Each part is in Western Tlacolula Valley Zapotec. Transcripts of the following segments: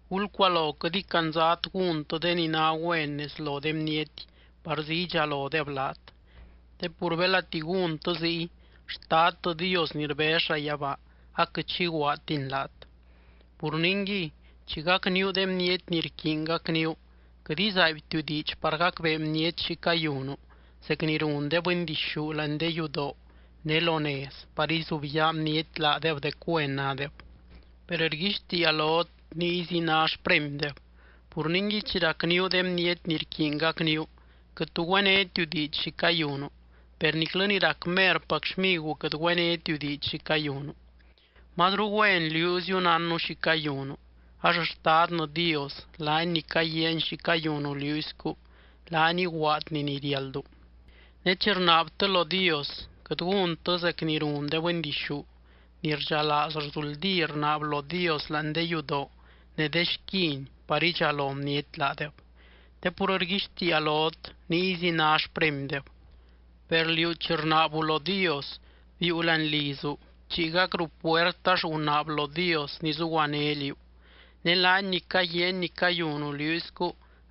’Gulcualo quɨt icandzat gúntɨ de ni ná güen nez lo de bniety parzí idxalodeb laat. Te pur belati gúntɨ ziy, Xtadtɨ Dios ni rbez llayabaa aquɨt xi iguaadtiny laat. Pur ningui, chi gacníu de bniety ni rquiiny gacníu, quɨt izaaibtiu diidx par gacbee bniety xi cayunu zec ni run de bɨndixú láani de yudoo ne lo nez par izubyaa bniety laadeb dec güen nádeb. Per rguixtiia lot niyzi ná xpremydeb. Pur ningui chi racníu de bniety ni rquiiny gacníu, quɨt tu güénetiu diidx xi cayunu, per niclɨ ni rac merpac xmiguu quɨt güénetiu diidx xi cayunu. Mazru güen liúziu nánnu xi cayunu, ax Xtadnɨ Dios, laany ni caguiaany xi cayunu liúiscu, laany iguaadny ni riáldu. ’Ne chi rnaabtɨ lo Dios, quɨt gúntɨ zec ni run de bɨndixú, ni rdxalaaz rzuldí rnaab lo Dios láani de yudoo ne de xquin par idxalo bniety laadeb. Te pur rguixtiia lot niyzi ná xpremydeb. Per liú chi rnaabu lo Dios, biiu láani lizu, bchiigac ruu puert ax gunaab lo Dios ni zuguané liú. Ne laany ni caguiaany ni cayunu liúiscu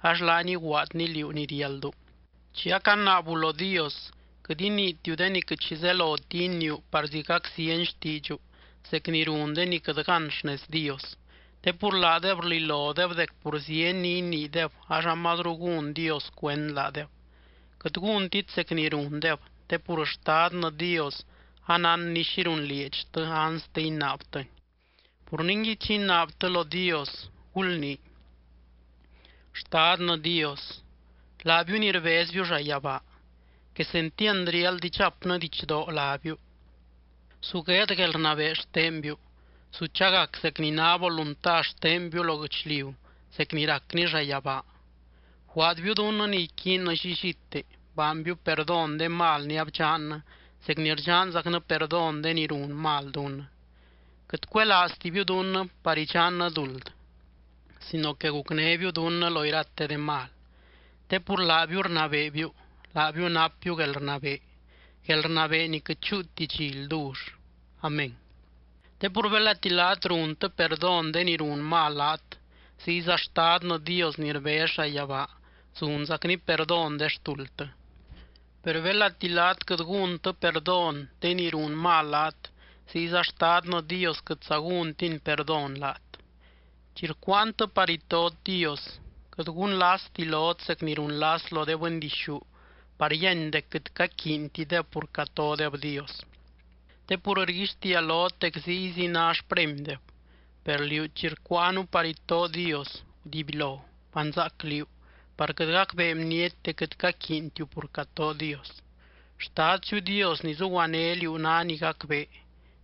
ax laany iguaadny liú ni riáldu. ’Chi acanaabu lo Dios, quɨt iniitiu de ni quɨt xi zeloti iniiu parzí gac zieny xtiidxu zec ni run de ni quɨt gán xnez Dios. Te pur laadeb rlilodeb dec pur zieny ni iniideb ax amazru gún Dios cuend laadeb. Quɨt gúntit zec ni rundeb, te pur Xtadnɨ Dios anánny xi runlieedxtɨ anste inaabtɨni. Pur ningui, chi inaabtɨ lo Dios, gulnii: Xtadnɨ Dios, laabiu ni rbezbiu llayabaa, quesentiand riáld idxapnɨ didxdoo lábiu. Su gueed guelrnabee xtenbiu. Su chagac zec ni ná volunta xtenbiu lo guɨchliu zec ni racni llayabaa. Bguaadbiu dunnɨ ni iquiinnɨ llillite. Baanbiu perdón de mal ni abdxannɨ zec ni rdxanzacnɨ perdón de ni run mal dunnɨ. Quɨt cuelaaztibiu dunnɨ par idxannɨ duld sino que gucnébiu dunnɨ lo irate de mal. Te pur laabiu rnabeebiu, laabiu napbiu guelrnabee, guelrnabee ni quɨt chúuti dxi ldull. Amén. ’Te pur belati laat runtɨ perdón de ni run mal laat, ziyza Xtadnɨ Dios ni rbez llayabaa zunzacny perdón de xtuldtɨ. Per belati laat quɨt gúntɨ perdón de ni run mal laat, ziyza Xtadnɨ Dios quɨtza gúntiny perdón laat. ’Chi rcuuantɨ par itot Dios, quɨt gunlasti lot zec ni runlas lo de bɨndixú par yíany dec quɨt caquiintideb pur catodeb Dios. Te pur rguixtiia lot dec ziyzi ná xpremydeb. Per liú chi rcuuanu par itoo Dios, gudibylo, banzaac liú par quɨt gacbee bniety dec quɨt caquiintiu pur catoo Dios. Xtadtiziu Dios ni zuguané liú ná ni gacbee,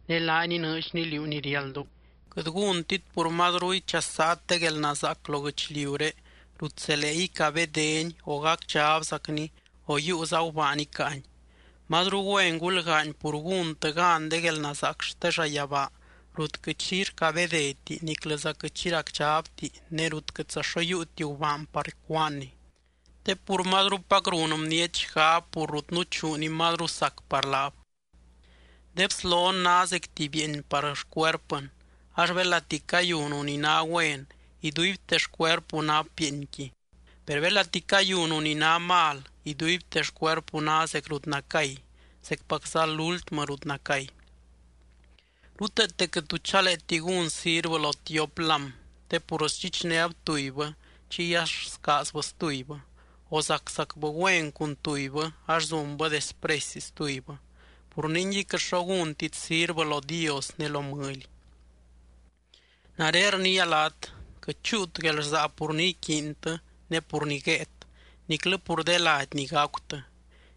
ne laany inɨɨdxny liú ni riáldu. ’Quɨt gúntit pur mazru ichasaat de guelnazaac lo guɨchliuré rut zelee icabédeni o gacdxabzacni o yiiuza gubaan icáani. Mazru güen gulgaany pur gúntɨ gan de guelnazaac xte llayabaa rut quɨt xi rcabedeti niclɨza quɨt xi racdxabti ne rut quɨtza xo yiiuti gubaan par cúaanni. Te pur mazrupac run bniety xgab pur rut nuchuu ni mazru sac par laab. ’De bslon ná zec tuby bieeny par xcuerpɨn. Ax belati cayunu ni ná güen, iduibte xcuerpu nap bieenqui. Per belati cayunu ni ná mal, iduibte xcuerpu ná zec rut nacay, ¡zecpacza lúltmɨ rut nacay! ’Ruteete quɨt tu chaleeti gún sirvɨ lo tiop lám, te pur sdxichnéb tubybɨ chiy ax scaazbɨ stubybɨ, o zaczacbɨ güen cun tubybɨ ax zunbɨ despresy stubybɨ. Pur ningui quɨt xo gúntit sirvɨ lo Dios ne lo mɨly. ’Nare rniia laat: Quɨt chúut guelrsaa pur ni iquiintɨ ne pur ni guéet, niclɨ pur de lady ni gacutɨ.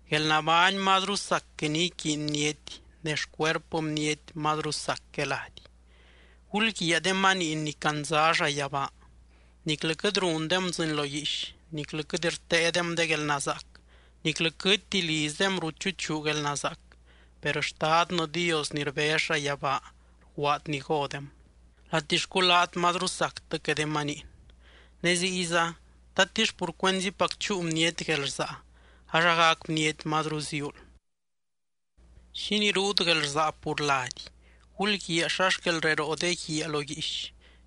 Guelnabány mazru sac que ni iquiiny bniety, ne xcuerpɨ bniety mazru sac que lady. Gulguiaa de maniin ni candza llayabaa. Niclɨ quɨt rundem dzɨɨny lo guiix niclɨ quɨt rteedem de guelnazaac, niclɨ quɨtti lizdem rut chuchuu guelnazaac, per Xtadnɨ Dios ni rbez llayabaa rguaad ni godem. ¡Latixcu laat mazru sactɨ que de maniin! Ne ziyza, ¿tatix pur cuenzipac chúu bniety guelrsaa ax agac bniety mazru ziuul? ’¿Xínii ruut guelrsaa pur lady? Gulguiaa xa xquel reroo de guiaa lo guiix.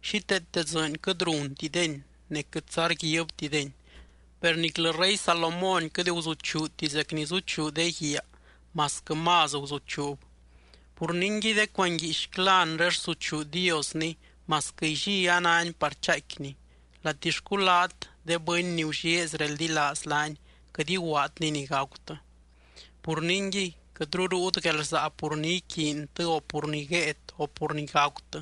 Xíteete dzɨɨny quɨt runtideni ne quɨtza rguibtideni, per niclɨ rey Salomón quɨt guzuchuuti zec ni zuchuu de guiaa masquɨ más guzuchuub. Pur ningui, de cuanguiixcla anre rsuchuu Diosni masquɨ illí a náni par chaaicquini. ¡Latixcu laat, de bɨny ni gullieezy reldilaaz laany, quɨt iguaadny ni gacutɨ! Pur ningui, quɨtru ruut guelrsaa pur ni iquiintɨ, o pur ni guéet, o pur ni gacutɨ.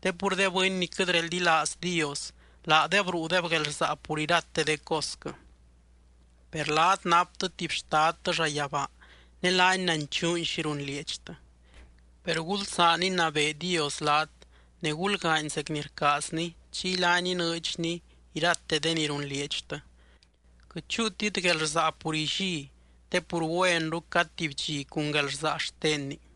Te pur de bɨny ni quɨt reldilaaz Dios, laadeb ruudeb guelrsaa pur irate de cosquɨ. Per laat naptɨ tuby Xtadtɨ llayabaa, ne laany nanchuuny xi runlieedxtɨ. Per gulsaan inabee Dios laat, ne gulgaany zec ni rcaazny, chiy laany inɨɨdxny irate de ni runlieedxtɨ. Quɨt chúutit guelrsaa pur illí, te pur güenru cad tuby dxi cun guelrsaa xtenni.